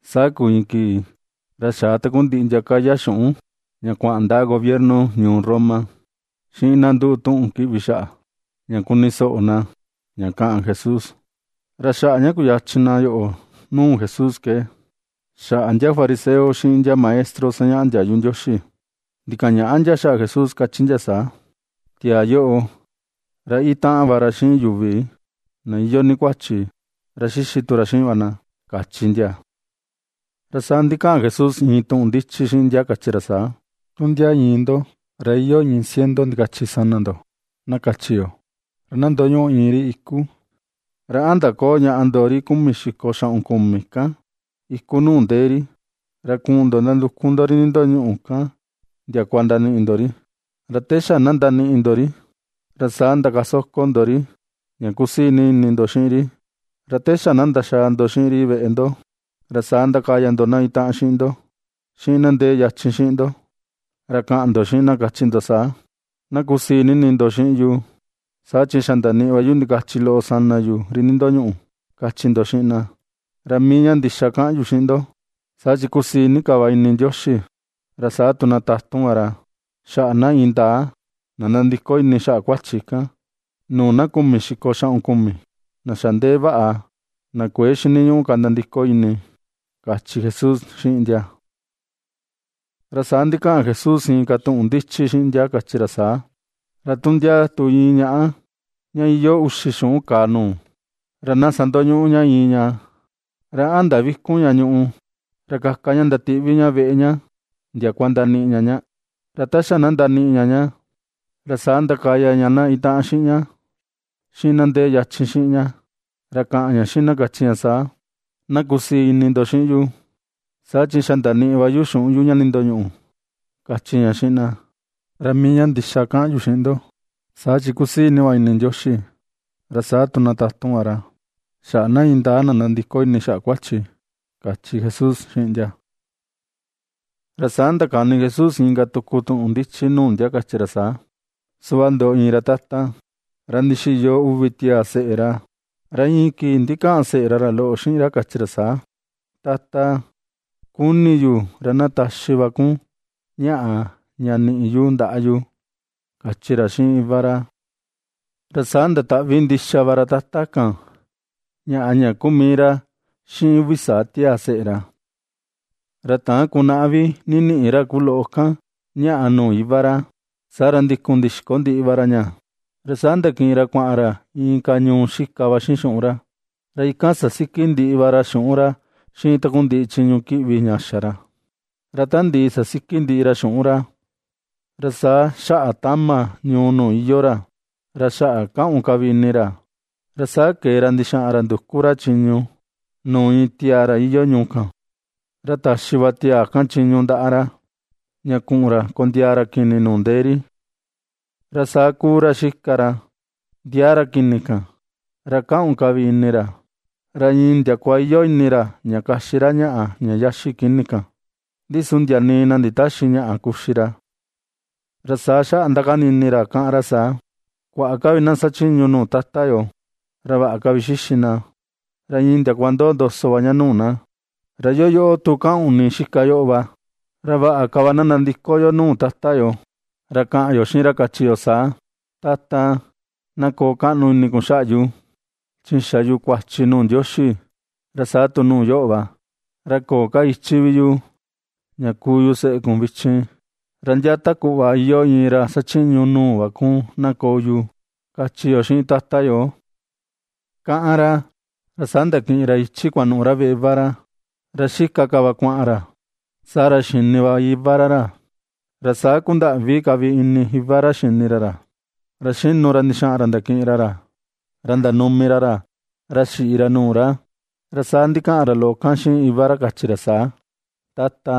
Saa kuu iin kii ra xaa takundiꞌi ndia kaya xuꞌun ña kuaꞌan ndaꞌa gobierno ñuu Roma, xiꞌin na nduꞌu tuꞌun kiꞌvi xaꞌa, ña kuni soꞌo na ña kaꞌan Jesús. Ra xaꞌa ña kuyachin na yoꞌo nuu Jesús ke xaꞌa ndiaa fariseo xiꞌin ndiaa maestro sañaꞌa ndiayu Ndioxi, ndikaꞌan ñaꞌa ndia xaꞌa Jesús kachi ndia saa: ―Tiaa yoꞌo, ra itaꞌan va ra xiꞌin yuvi, na iyoo ni kuachi, ra xixi tu ra xiꞌin va na ―kachi ndia. Ra saa ndikaꞌan Jesús iin tuꞌun ndichi xiꞌin ndia kachi ra saa: ―Tu ndia iin ndo, ra iyoo iin ciento ndikachi sana ndo, na kachi yo. Ra na ndoñuꞌu iin ri iku, ¿ra a ndaköo ñaꞌa ndo ri kumi xiko xaꞌun kumi kan iku nuu ndee ri, ra kuꞌun ndo ndanduku ndo ri nindoñuꞌu kan ndiakua ndaniꞌi ndo ri? Ra te xa na ndaniꞌi ndo ri, ra saa ndakasoko ndo ri ña kusii ni ini ndo xiꞌin ri. Ra te xa na ndaxaa ndo xiꞌin ri veꞌe ndo, ra saa ndakaya ndo na itaꞌan xiꞌin ndo, xiꞌin na ndee yachin xiꞌin ndo. Ra kaꞌan ndo xiꞌin na kachi ndo saa: “Na kusii ini ndo xiꞌin yu saa chi xa ndaniꞌi va yu ndikachi loꞌo sana yu ri ndindoñuꞌu”, kachi ndo xiꞌin na. Ra mii ña ndixa kaꞌan yu xiꞌin ndo, saa chi kusii ni ka va ini Ndioxi, ra saa tu na tatun va ra, xaꞌa na indaa na nandiko ini xaꞌa kuachi kan, nuu na kumi xiko xaꞌun kumi na xa ndee vaꞌa na kuëe xiniñuꞌu ka nandiko ini ―kachi Jesús xiꞌin ndia. Ra saa ndikaꞌan Jesús inka tuꞌun ndichi xiꞌin ndia kachi ra saa: ―Ra tu ndia tu iin ñaꞌa ña iyoo uxi xuꞌun kaa nuu, ra na sandoñuꞌu ña iin ña, ¿ra a ndavikun ña ñuꞌu, ra kaka ña ndatiꞌvi ña veꞌe ña ndiakua ndaniꞌi ña ña? Ra ta xa na ndaniꞌi ña ña, ra saa ndakaya ña na itaꞌan xiꞌin ña, xiꞌin na ndee yachin xiꞌin ña, ra kaꞌan ña xiꞌin na kachi ña saa: “Na kusii ini ndo xiꞌin yu, saa chi xa ndaniꞌi va yu xuꞌun yu ña nindoñuꞌu”, kachi ña xiꞌin na. Ra mii ña ndixa kaꞌan yu xiꞌin ndo, saa chi ^kusii ni va ini Ndioxi ra saa tu na tatun va ra, xaꞌa na indaa na nandiko ini xaꞌa kuachi ―kachi Jesús xiꞌin ndia. Ra saa ndakani Jesús inka tuku tuꞌun ndichi nuu ndia kachi ra saa: ―Suꞌva ndoꞌo iin ra tata, ra ndixiyo uvi tiaa seꞌe ra. Ra iin kii ndikaꞌan seꞌe ra ra loꞌo xiꞌin ra, kachi ra saa: “Tata, kuni yu ra na taxi va kun ñaꞌa ña niꞌi yu ndaꞌa yu”, kachi ra xiꞌin iva ra. Ra saa ndataꞌvi ndixa va ra tata kan ñaꞌa ña kuu mii ra xiꞌin uvi saa tiaa seꞌe ra. Ra täan kunaꞌa vi ndiniꞌi ra ku loꞌo kan ñàꞌà nuu iva ra, saa ra ndikun ndixiko ndiꞌi va ra ña. Ra saa ndakiꞌin ra kuaꞌan ra inka ñuu xika va xiꞌin xuꞌun ra. Ra ikan sasiki ndiꞌi va ra xuꞌun ra xiꞌin takundiꞌi chiñu kiꞌvi ña xa ra. Ra ta ndiꞌi sasiki ndiꞌi ra xuꞌun ra, ra saa xaꞌa tama ñuu nuu iyoo ra, ra xaꞌa kaꞌun ka vi ini ra. Ra saa kee ra ndixaꞌan ra nduku ra chiñu nuu iin tiaa ra iyoo ñuu kan, ra taxi va tiaa kan chiñu ndaꞌa ra, ña kuꞌun ra kondiaa ra kini nuu ndee ri. Ra saa ^kuu ra xika ra ndiaa ra kini kan, ra kaꞌun ka vi ini ra, ra iin ndiakua iyoo ini ra ña kaxi ra ñaꞌa ña xaxi kini kan, ndi su ndia nii na nditäxi ñaꞌa kuxi ra. Ra saa xaꞌa ^ndakani ini ra, ^kaꞌan ra saa: “¡Kuaꞌa ka vi na xachiñu nuu tata yo, ra vaꞌa ka vi xixi na, ra iin ndiakua ndoo ndoso va ña nuu na, ra yoo yoꞌo tu kaꞌun ka vi ini xika yoꞌo va! Ra vaꞌa ka va na nandiko yo nuu tata yo, ra kaꞌan yo xiꞌin ra kachi yo saa: Tata, na koo kaꞌnu ini kun xaꞌa yu, chi xa yu kuachi nuu Ndioxi, ra saa tu nuu yoꞌo va. Ra köo ka ichi vi yu ña kuu yu seꞌe kun vichin, ra ndia ta kuꞌva iyoo iin ra xachiñu nuu va kun na koo yu, kachi yo xiꞌin tata yo”, ^kaꞌan ra. Ra saa ndakiꞌin ra ichi kuanuꞌu ra veꞌe iva ra. Ra xika ka va kuaꞌan ra saa ra xa xini va iva ra ra, ra saa kundaꞌvi ka vi ini iva ra xini ra ra, ra xinu ra ndixaꞌan ra ndakiꞌin ra ra, ra ndanumi ra ra, ra xiꞌi ra nuu ra. Ra saa ndikaꞌan ra loꞌo kan xiꞌin iva ra kachi ra saa: “Tata,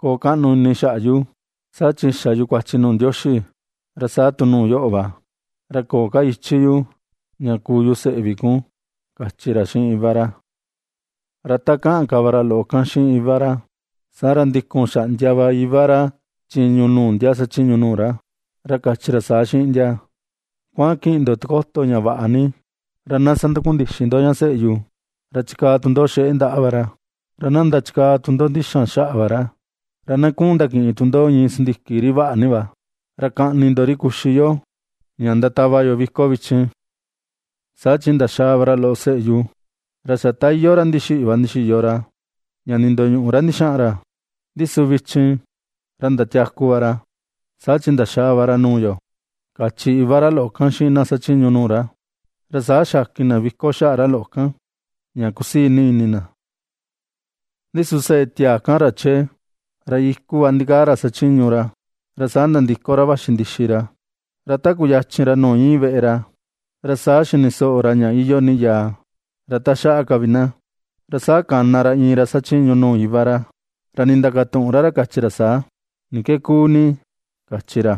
koo kaꞌnu ini xaꞌa yu, saa chi xa yu kuachi nuu Ndioxi, ra saa tu nuu yoꞌo va. Ra köo ka ichi yu ña kuu yu seꞌe vi kun”, kachi ra xiꞌin iva ra. Ra ta kaꞌan ka va ra loꞌo kan xiꞌin iva ra, saa ra ndikun xaꞌndia va iva ra chiñu nuu ndia xachiñu nuu ra, ra kachi ra saa xiꞌin ndia: “Kuaꞌan kiꞌin ndo tikoto ña vaꞌa ni, ra na sandakundixi ndo ña seꞌe yu, ra chikaa tu ndo xeꞌe ndaꞌa va ra, ra na ndachikaa tu ndo ndixan xaꞌa va ra. Ra na kuꞌun ndakiꞌin tu ndo iin sindiki ri vaꞌa ni va, ra kaꞌni ndo ri kuxi yo ña ndatava yo viko vichin. Saa chi ndaxaa va ra loꞌo seꞌe yu. Ra xa ta iyoo ra ndixiꞌi va ndixiyo ra, ña ndindoñuꞌu ra ndixaꞌan ra, ndi su vichin ra ndatiaku va ra saa chi ndaxaa va ra nuu yo”, kachi iva ra loꞌo kan xiꞌin na xachiñu nuu ra. Ra saa xakin na viko xaꞌa ra loꞌo kan ña ^kusii ni ini na. ’Ndi su seꞌe tiaa kan ra chee, ra iku va ndikaa ra xachiñu ra. Ra saa nandiko ra vaxi ndixi ra, ra ta kuyachin ra nuu iin veꞌe ra, ra saa xini soꞌo ra ña iyoo ni yaa, ra taxaꞌa ka vi na. Ra saa kana ra iin ra xachiñu nuu iva ra, ra nindakatuꞌun ra ra kachi ra saa: “¿Ni ke kuu ni?”, kachi ra.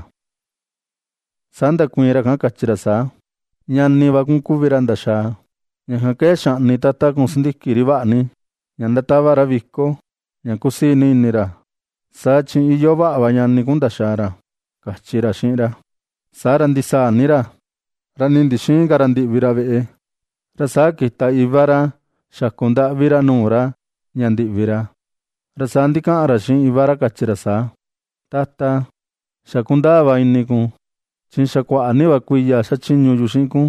Saa ndakuiin ra kan kachi ra saa: “Ñani va kun kuvi ra ndaxaa, ña kan ke xaꞌni tata kun sindiki ri vaꞌa ni, ña ndatava ra viko ña ^kusii ni ini ra, saa chi iyoo vaꞌa va ñani kun ndaxaa ra”, kachi ra xiꞌin ra. Saa ra ndisaa ni ra, ra nii ndixïin ka ra ña ndiꞌvi ra veꞌe. Ra saa kita iva ra ña xaku ndaꞌvi ra nuu ra ña ndiꞌvi ra. Ra saa ndikaꞌan ra xiꞌin iva ra kachi ra saa: “Tata, xa kundaa va ini kun chi xa kuaꞌa ni va kuiya xachiñu yu xiꞌin kun,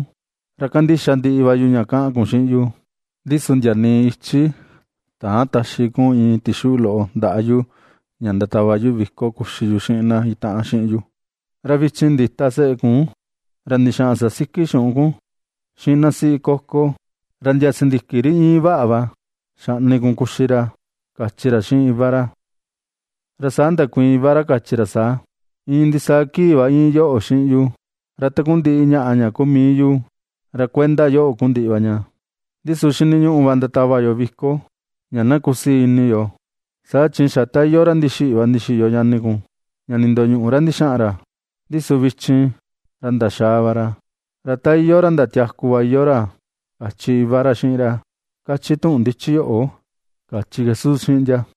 ra kandixa ndiꞌi va yu ña kaꞌan kun xiꞌin yu, ndi su ndia nii ichi täan taxi kun iin tixuꞌu loꞌo ndaꞌa yu ña ndatava yu viko kuxi yu xiꞌin na itaꞌan xiꞌin yu. Ra vichin ndita seꞌe kun, ra ndixaꞌan sasiki xuꞌun kun xiꞌin na siꞌi kókó, ra ndia sindiki ri iin vaꞌa va xaꞌni kun kuxi ra”, kachi ra xiꞌin iva ra. Ra saa ndakuiin iva ra kachi ra saa: “Iin ndisaa kii va íin yoꞌo xiꞌin yu. Ra takundiꞌi ñaꞌa ña ku mii yu, ra kuenda yoꞌo kuu ndiꞌi va ña. Ndi su xiniñuꞌu va ndatava yo viko, ña na kusii ini yo, saa chi xa ta iyoo ra ndixiꞌi va ndixiyo ñani kun, ña ndindoñuꞌu ra ndixaꞌan ra, ndi su vichin ra ndaxaa va ra, ra ta iyoo ra ndatiaku va iyoo ra”, kachi iva ra xiꞌin ra, kachi tuꞌun ndichi yoꞌo ―kachi Jesús xiꞌin ndia.